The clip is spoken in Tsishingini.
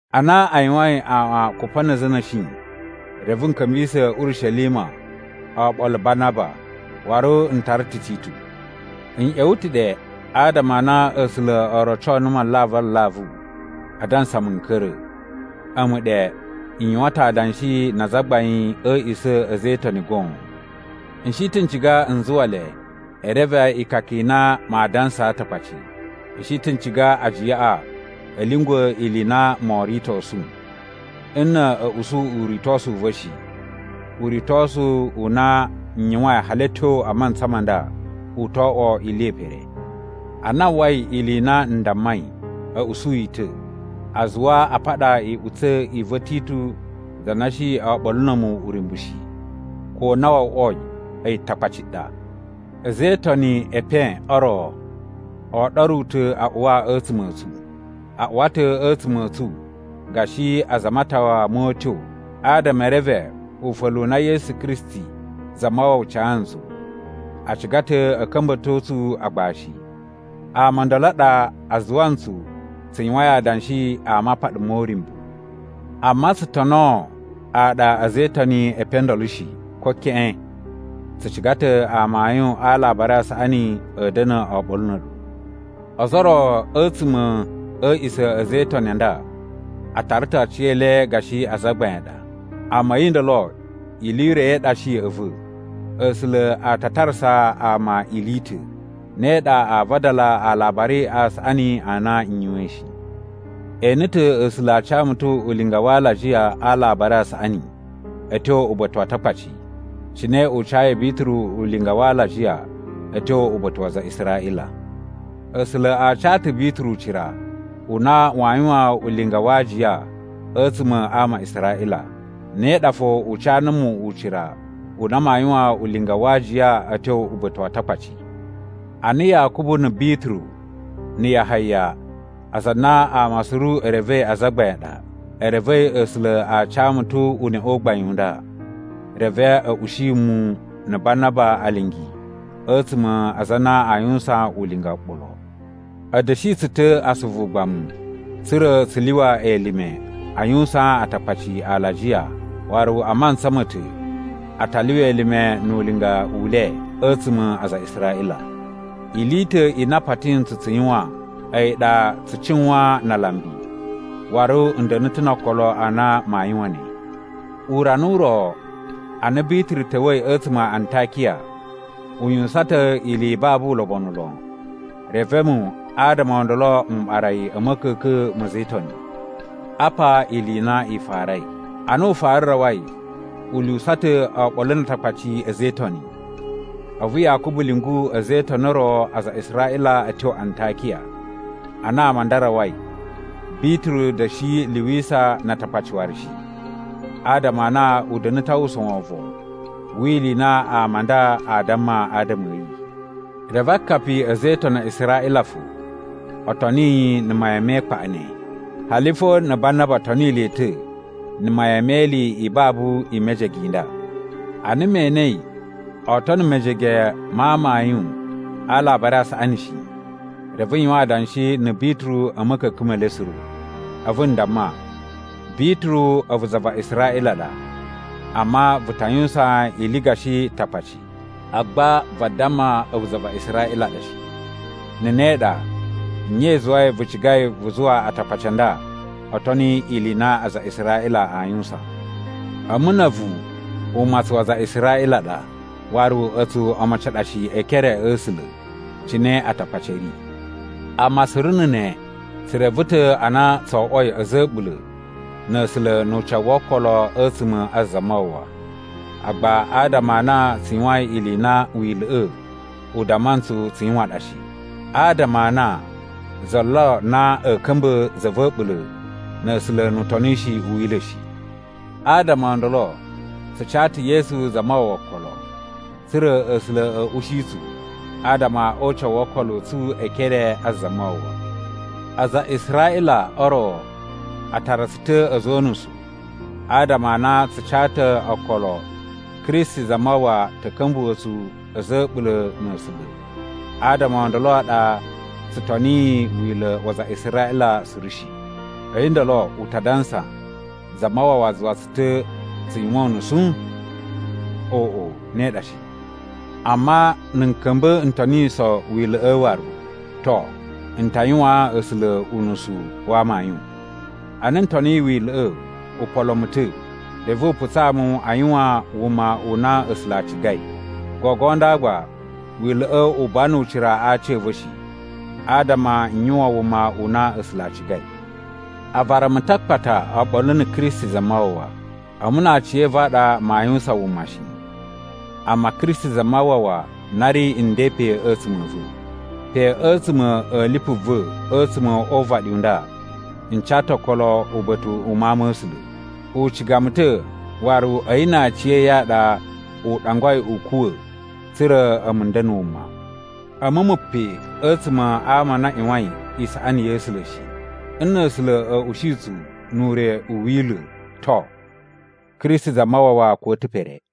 Ana a yuwain aꞌwan kupa na̱ a̱za̱ a̱ na̱shi, reve n ka̱mbisa̱ Urishelima oɓolo Banaba, waru n tara ta̱ Titu. N ꞌya̱wa̱ ta̱ ɗe adama a na A̱sula̱ o roco numu alavu alavu adansa mu n ka̱ra̱. A̱mu ɗe, n yuwan ta̱ adanshi na azagbain a̱ a̱a̱ꞌisa̱ a̱ a̱za̱ e Itoni goon. N shi ta̱ n ciga n zuwa le e reve ikaka i na maa dansaa Atakpaci. N shi ta̱ n ciga ajiyaꞌa a̱ lyungwa̱ ili i na moo ritosu. Nna̱ a̱ usu uritosu u va̱ shi, uritosu u na n yuwain hali a̱ tyo a mantsa ma nda u to oꞌwo ili ye pere. Ana a uwwai ili i na n dammai, a̱ usu yi ta̱. A zuwa a paɗa iꞌutsa̱ i va̱ Titu za na shi oɓolo na̱ a̱mu uryumbu shi, ko na wo oꞌwoi a̱yi Takpaci ɗa. A̱za̱ e itoni e epen o ro o oɗoru ta̱ a uwa a̱tsuma̱ a̱ tsu. A uwa ta̱ a̱tsuma̱ a̱ tsu gashi aza a matawa mo utyo adama e reve ufa̱lu u na Yesu Kristi Zamawawa ca ntsu. A ciga ta̱ a̱ ka̱mba̱to tsu agbashi. Ama o ndolo a ɗa a zuwa ntsu tsu yuwain adanshi a mapaɗa mo uryumbu. Amma tsu tonoo aɗa a̱za̱ e itoni e epen o ndolo shi, ko keꞌen. Tsu ciga ta̱ amayun a Alabari a Saꞌani a̱ da̱na̱ oɓolo na̱ a̱ɗu. (Ozo o ro a̱tsuma̱ a̱ a̱a̱ꞌisa̱ a̱ a̱za̱ e Itoni a nda a tara ta̱ aciyele gashi azagbain a ɗa, amma a̱yi ndolo ili i ro i ɗa shi ya̱ꞌa̱ va̱. A̱sula̱ a ta tarasa ama ili i ta̱.) Ne ɗa aa vadala Alabari a Saꞌani a na n yuwain shi. E ene ta̱ A̱sula̱ a ca mu ta̱ ulinga wa alajiya a Alabari a Saꞌani a̱ tyo uba̱ta̱ wa Atakpaci, cine u cayi Bituru ulinga wa alajiya a̱ tyo uba̱ta̱ wa aza a Israꞌila. A̱sula̱ a ca ta̱ Bituru ucira u na waa yuwan ulinga wa aajiya a̱tsuma̱ a ama a Israꞌila. Ne ɗa fo u ca numu ucira u na maa yuwan ulinga wa aajiya a̱ tyo uba̱ta̱ wa Atakpaci. Ana Yakubu na̱ Bituru na̱ Yahaya (aza a na ama suru e revei azagbain a ɗa) e revei A̱sula̱ a ca mu ta̱ uneꞌe u gbain u nda, reve a̱ ushi mu na̱ Banaba alingi a̱tsuma̱ a aza a na aa yuwusan ulinga oɓolo. A̱ da̱shi tsu ta̱ asuvu ugbamu tsa̱ra̱ tsu lyuwa elime a yuwusaan Atakpaci alajiya, waru a mantsa ma̱ ta̱ a ta lyuwa elime nu ulinga u le a̱tsuma̱ a aza a Israꞌila. Ili i ta̱ i na a pati ntsu tsu yuwan, a̱yi ɗa tsu cuwan na alambi, waru n da̱na̱ ta̱ no okolo a na maa yuwan ne! Urana u ro, ana Bituru ta̱wa̱i a̱tsuma̱ a Antakiya, u yuwusan ta̱ ili i babu ulobonu lon, reve a̱mu adama o ndolo m ɓara yi a̱ ma̱ka̱ka̱n ma̱ a̱za̱ e Itoni. Apa ili i na i farai: Ana u fara rawai, u lyuwusa ta̱ oɓolo na Atakpaci a̱za̱ e Itoni. A̱vu Yakubu lyungu a̱za̱ e Itoni o ro aza a Israꞌila a̱ tyo Antakiya. Ana ama a nda a rawai, Bituru da̱shi lyuwisa na Atakpaci waru shi, adama a na u da̱na̱ ta̱ a uwwusa wovon wi ili i na ama a nda aa damma adama a̱ yi. Reve akapi a̱ a̱za̱ e Itoni a Israꞌila fo o toni yi na̱ mayan me ikpaꞌa ne, hali fo na̱ Banaba toni le ta̱ na̱ mayan me ili i babu i mejege i nda. Ana me enei oo tono mejege ma amayun a Alabari a Saꞌani shi, reve n yuwan adanshi na̱ Bituru a̱ ma̱ka̱ka̱n me le suru. A̱vu n damma, “Bituru, a̱vu za va Israꞌila ɗa, amma vu ta yuwusan ili gashi Takpaci, agba vadamma a̱vu za va Israꞌila ɗa shi. Na̱ ne ɗa, nye i zuwai vu cigai vu zuwa Atakpaci a nda o toni ili i na aza a Israꞌila a yuwusan? “A̱mu na̱ a̱vu umatsun wa aza a Israꞌila a ɗa, waru a̱tsu omocin a ɗa shi e ekere a̱ A̱sula̱ cine Atakpaci a̱ ri. Amma suru na̱ ne, tsu reve ta̱ a na tso oꞌwoi a̱za̱ a̱ a̱ɓula̱ na̱ A̱sula̱ nu ucawu wo okolo a̱tsuma̱ a Zamawawa, agba adama a na tsu yuwain ili i na Wila̱ꞌa̱ u damma ntsu tsu yuwan ɗa shi, adama a na za lo na a̱ ka̱mba̱ za va̱ a̱ɓula̱ na̱ A̱sula̱ nu utonishi u Wila̱ shi. Adama o ndolo tsu ca ta̱ Yesu Zamawawa okolo, tsa̱ra̱ A̱sula̱ a̱ ushi tsu adama o ucawu wo okolo a̱ tsu e ekere a Zamawawa. “Aza a Israꞌila o ro a tara tsu ta̱ a̱za̱ o unusu adama a na tsu ca ta̱ okolo Kristi Zamawawa ta̱ ka̱mbuwa̱ tsu a̱za̱ a̱ a̱ɓula̱ na̱ A̱sula̱ adama o ndolo a ɗa tsu toniyi Wila̱ wa aza a Israꞌila suru shi. A̱yi ndolo u ta dansa Zamawawa zuwa tsu ta̱ tsu yuwan unusu? Oꞌo, ne ɗa shi! Amma na̱ n ka̱mba̱ n toniso Wila̱ꞌa̱ waru, to, n ta yuwaan A̱sula̱ unusu wa amayun. Ana n toniyi Wila̱ꞌa̱, u polo mu ta̱, reve u putsaa mu a yuwan wuma u na A̱sula̱ a cigai. Gogo nda gba Wila̱ꞌa̱ u buwa nu ucira a aci a̱ va̱ shi, adama n yuwan wuma u na A̱sula̱ a cigai. A vara mu ta̱ a akpata oɓolo na̱ Kristi Zamawawa. A̱mu na aciya̱va̱ a ɗa maa yuwusan wuma shi, amma Kristi Zamawawa na ri nden pe a̱tsuma̱ a̱ va̱. Pe a̱tsuma̱ a̱ lipu va̱ a̱tsuma̱ o uvaɗi u nda n ca ta̱ okolo uba̱ta̱ u Mawun ma̱ A̱sula̱. U ciga mu ta̱ waru a̱yi na aciya̱yi a ɗa u ɗangwai u kuwa̱ tsa̱ra̱ a̱mu n da̱na̱ wuma. A̱mu mu pe a̱tsuma̱ a ama a na a ꞌyuwain isaꞌani ya̱ A̱sula̱ shi. Nna̱ A̱sula̱ a̱ ushi tsu nu ure u Wila̱, to, Kristi Zamawawa kuwa̱ ta̱ pere.”